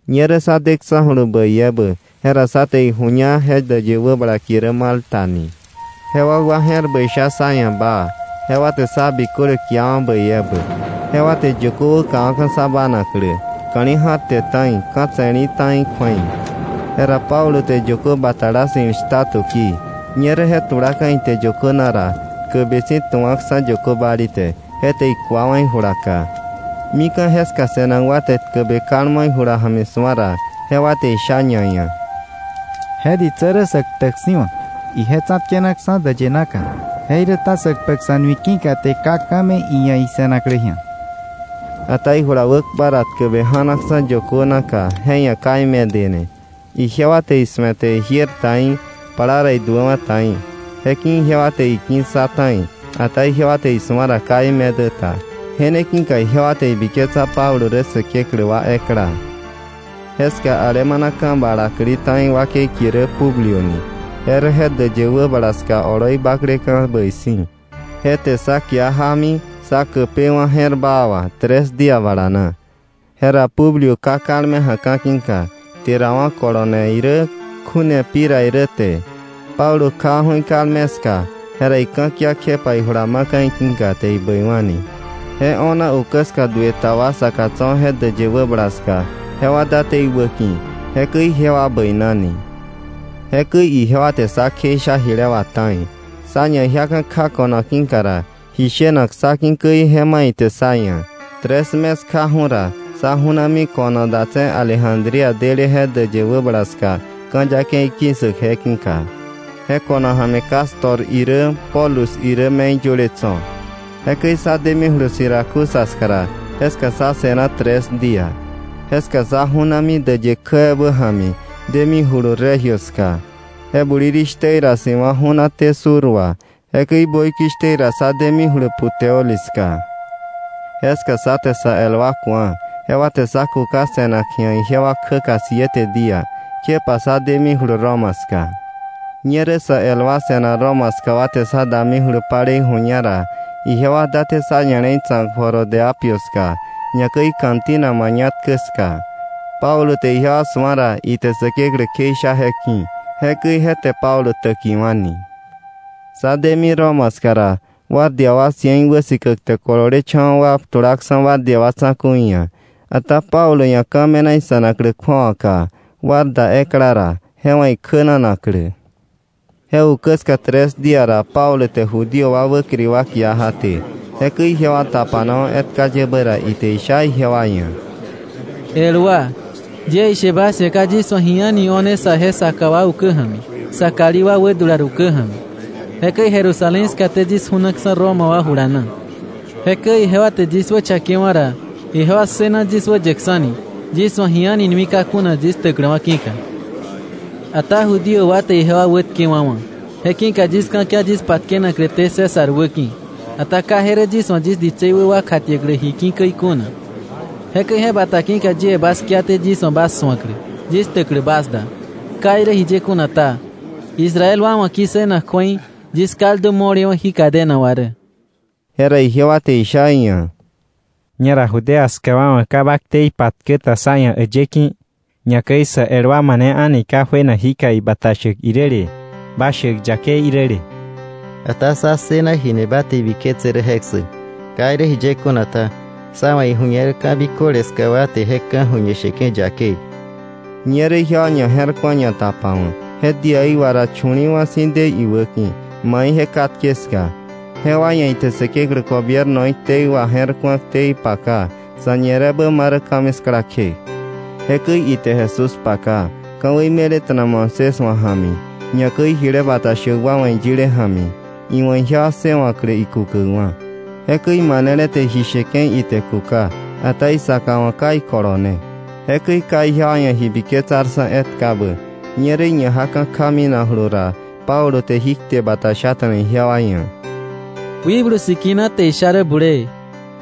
Ñerä sá deksa̱julu bäi ebä, jera sá je̱r ku̱a ite ra, je däyë wäbala kie rä Malta ni. Je wakwa je̱r bäi sha sá ia̱ baa, jewa te sá biköle kiawa̱ bäi ebä, jewa te yökö wäkawa̱ka̱ sá bánaklä, ka̱li̱ ja̱rte ta̱i, ka̱ tse̱lí̱ ta̱i kju̱ei. Jera Pablo te yökö batala ssi̱l shta tukii. Ñerä je tulaka̱ ite yökö na ra, tkäbe si̱ tu̱wa̱ksa̱ yökö bali te, je te ikuawa̱ ijula ka. Mika̱ jeska se̱nak wa te tkäbe kalmo ijula ja̱mi su̱a ra, jewa te isha ñaia̱: —Je ditsä rä sä ktäk si̱wa̱. Ije tsa̱tkenaksa̱ däyë naka, jeiräta sä kpäk sa̱ nui ki̱ka te ka ka̱ me̱ iia̱ ise̱naklä ji̱a. Ata ijula wäkpa ra tkäbe ja̱naksa̱ yökö naka, je ia̱ ka imedene. Ijewa te isu̱ete ijiër ta í̱, plaa iduäwa̱ ta í̱. Je ki̱ ijewa te iki̱ssa ta̱i, ata ijewa te isu̱a ra ka imedä ta. Je ne ki̱ka ijewa te ibiketsa Pablo rä säkeklä wa ekla. Jeska alemana ka̱ balakli ta̱i wakei kie rä Publio ni. Je rä je däyë wäbala ska oloi bakleka̱ bäi si̱, je te sá kia jámi, sá käpewa̱ je̱r baa wà, tres día bala na. Jera Publio ká kalme ja̱ka̱ ki̱ka, kterawa̱ kolone irä, kju̱ne pi ra irä te. Pablo kjawa̱ju̱ ikalme ska, jera ika̱kia kjepa ijula ma̱ka̱ iki̱ka, te ibäiwa̱ni. Je o̱na ukä ska duë ta wa saka tso̱ je däyë wäbala ska, jewa date iwäki̱. Jekäi ijewa bäinani. Jekäi ijewa te sá kjeisha jile wà ta̱i. Sá ñajiaka̱ kja ko̱no ki̱ ra, ji shenak sá ki̱ käi, je ma̱ ite sá ia̱. Tres mes kjaju̱ ra, sá ju̱nami ko̱no datse̱ Alejandría dele je däyë wäbala ska, ka̱ yakei ki̱ssäk je ki̱ka. Je ko̱no ja̱mi Cástor irä Pólux irä me̱i yöle tso̱. Jekäi sá demijulu Siracusa ska ra, jeska sá se̱na tres día. Jeska sá ju̱nami däyë kjä ebä ja̱mi, demijulu Regio ska. Je bulirishtä ra si̱wa̱ ju̱naté sur wà. Jekäi böikishtä ra sá demijulu Puteoli ska. Jeska sá te sa el wa ku̱a, jewa te sá kuka se̱nak ji̱a ijewa kjäka siete día. Jekjepa sá demijulu Roma ska. Ñerä sä el wa se̱nak Roma ska wa te sá damijulu palei ju̱ña ra, ijewa date sá ña̱le̱i tsa̱k Foro de Apio ska, ñakäi Cantina Mañatkä ska. Pablo te ijewa su̱a ra, ite Säkeklä kjeisha je ki̱. Jekäi je te Pablo täkiwa̱ni. Sá demi Roma ska ra, guardia wa cien wäsikäk te kololecha̱wa̱ wa tulaksa̱ guardia wa tsa̱ku̱i ia̱, ata Pablo ia̱ ka̱ me̱na ise̱naklä kju̱awaka, guarda ekla ra, je wa̱ ikjänanaklä. Je ukä ska tres día ra Pablo te Judío wa wäkiri wa kia jaté. Jekäi ijewa tapanawa̱ etka yebä ra, ite isha ijewa ia̱: —El wa, yie ishe bas ia̱, ka yis wa̱ ji a̱ni o̱ne saje saka wa ukä ja̱mi, sa kalí wa wädular ukä ja̱mi. Jekäi Jerusalén skaté yis ju̱naksa̱ Roma wa jula na. Jekäi ijewa te yis wächakewa̱ ra, ijewa ssëna yis wäyäksa̱ni yis wa̱ ji a̱ni nui ka kuna yis ktäkläwa̱ ki̱ka. Ata Judío wa te ijewa wätkewa̱wa̱. Je ki̱ka yis ka̱kia yis patkenakläté César wäki̱. Ata ka je rä yis wa̱ yis ditsei wä wa kjatiäklä ji ki̱ käi kuna. Jekäi je bata ki̱ka, yie bas kiaté yis wa̱ bas su̱aklä, yis ktäklä bas da. Ka irä jiye kuna ta, Israel wa wa̱ ki̱ssënak kju̱ei yis kaldu mo̱lewa̱ jí cadena wà rä. Jera ijewa te isha iia̱: —Ñera Judea ska wa wa̱ ka ba ktei patkä ta sá ia̱ äyë ki̱. Ñakäi sä el wa mane a̱ni ka juena jika ibata shäk iräle, ba shäk yakei iräle. Ata sá ssëna jini ba te ibiketse rä je ssäk. Ka irä jiye kuna ta, sá wa̱ iju̱ñer ka̱ biköle ska wa te je ka̱ju̱ñe sheke̱ yakei. Ñerä ijewa ñaje̱rku̱a ñatapawa̱k. Je díaí wa ra, chu̱li̱i̱wa̱ si̱ de iwäki̱, mai ije katke ska. Jewa ia̱ ite Säkeklä gobiernoí ktei waje̱rku̱a, ktei paka, sa̱ñirebä ma rä ka̱miskla kje. Jekäi ite Jesús paka, ka̱wei me̱leta̱na Moisés wa̱ ja̱mi, ñakäi jile bata shäk wa wa̱ iyile ja̱mi, iwa̱ ijewa ssëwa̱klä ikukäkwa̱. Jekäi manele te ji sheke̱ ite kuka, ata isaka wa̱ ka ikolone. Jekäi ka ijewa ia̱ ji biketsarksa̱ etkabä, ñerä iñajaka̱ kja minakjulu ra, Pablo jí kte shata̱na ijewa ia̱: —Wikblu Sikina te isha rä bulee,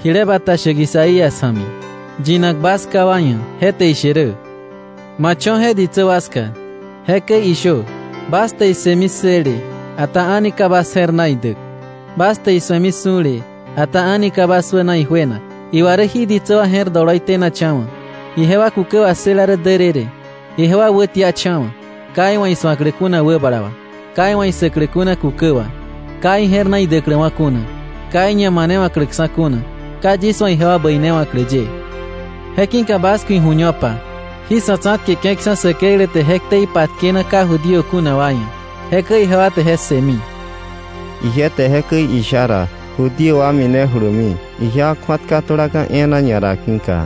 jile bata shäk Isaías ja̱mi, yinak bas ká wa ia̱, je te ishe rä: “Ma cho̱ je ditsä wa ska, jekäi ishö: ‘Bas te issëmi ssële, ata a̱ni ka bas je̱r na idäk, bas te isu̱emi su̱le, ata a̱ni ka bas wäna ijuenak. Iwa rä jí ditsä wa je̱r doloi tenacha̱wa̱, ijewa kukä wassëla rä därërë, ijewa wätiacha̱wa̱, ka iwa̱ isu̱aklä kuna wäbala wa, ka iwa̱ issäklä kuna kukä wa, ka ije̱r na idäkläwa̱ kuna, ka iñamanewa̱kläksa̱ kuna, ka yis wa̱ ijewa bäinewa̱klä ye.’” Je ki̱ka bas ku̱ iju̱ñopa, jí sa̱ tsa̱tkeke̱ksa̱ Säkeklä te je ktei patkena ka Judío kuna wa ia̱. Jekäi ijewa te je ssëmi. Ije te jekäi isha ra, Judío wa minejulumi, ijewa kju̱atka tulaka̱ e̱e̱na ñara ki̱ka.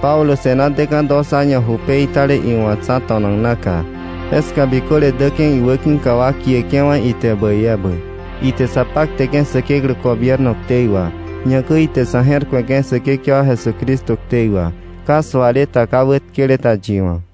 Pablo se̱na deka̱ dos año ju peitale iwa̱ tsa̱to̱nak naka. Jeska biköle däke̱ iwäki̱ka wa kieke̱wa̱ ite bäi ebä. Ite sa pakteke̱ Säkeklä gobierno ktei wà. Ñakäi ite sa̱ je̱r ku̱eke̱ Säkekewa Jesucristo ktei wà, ka suale ta, ka wätkele ta yi wa̱.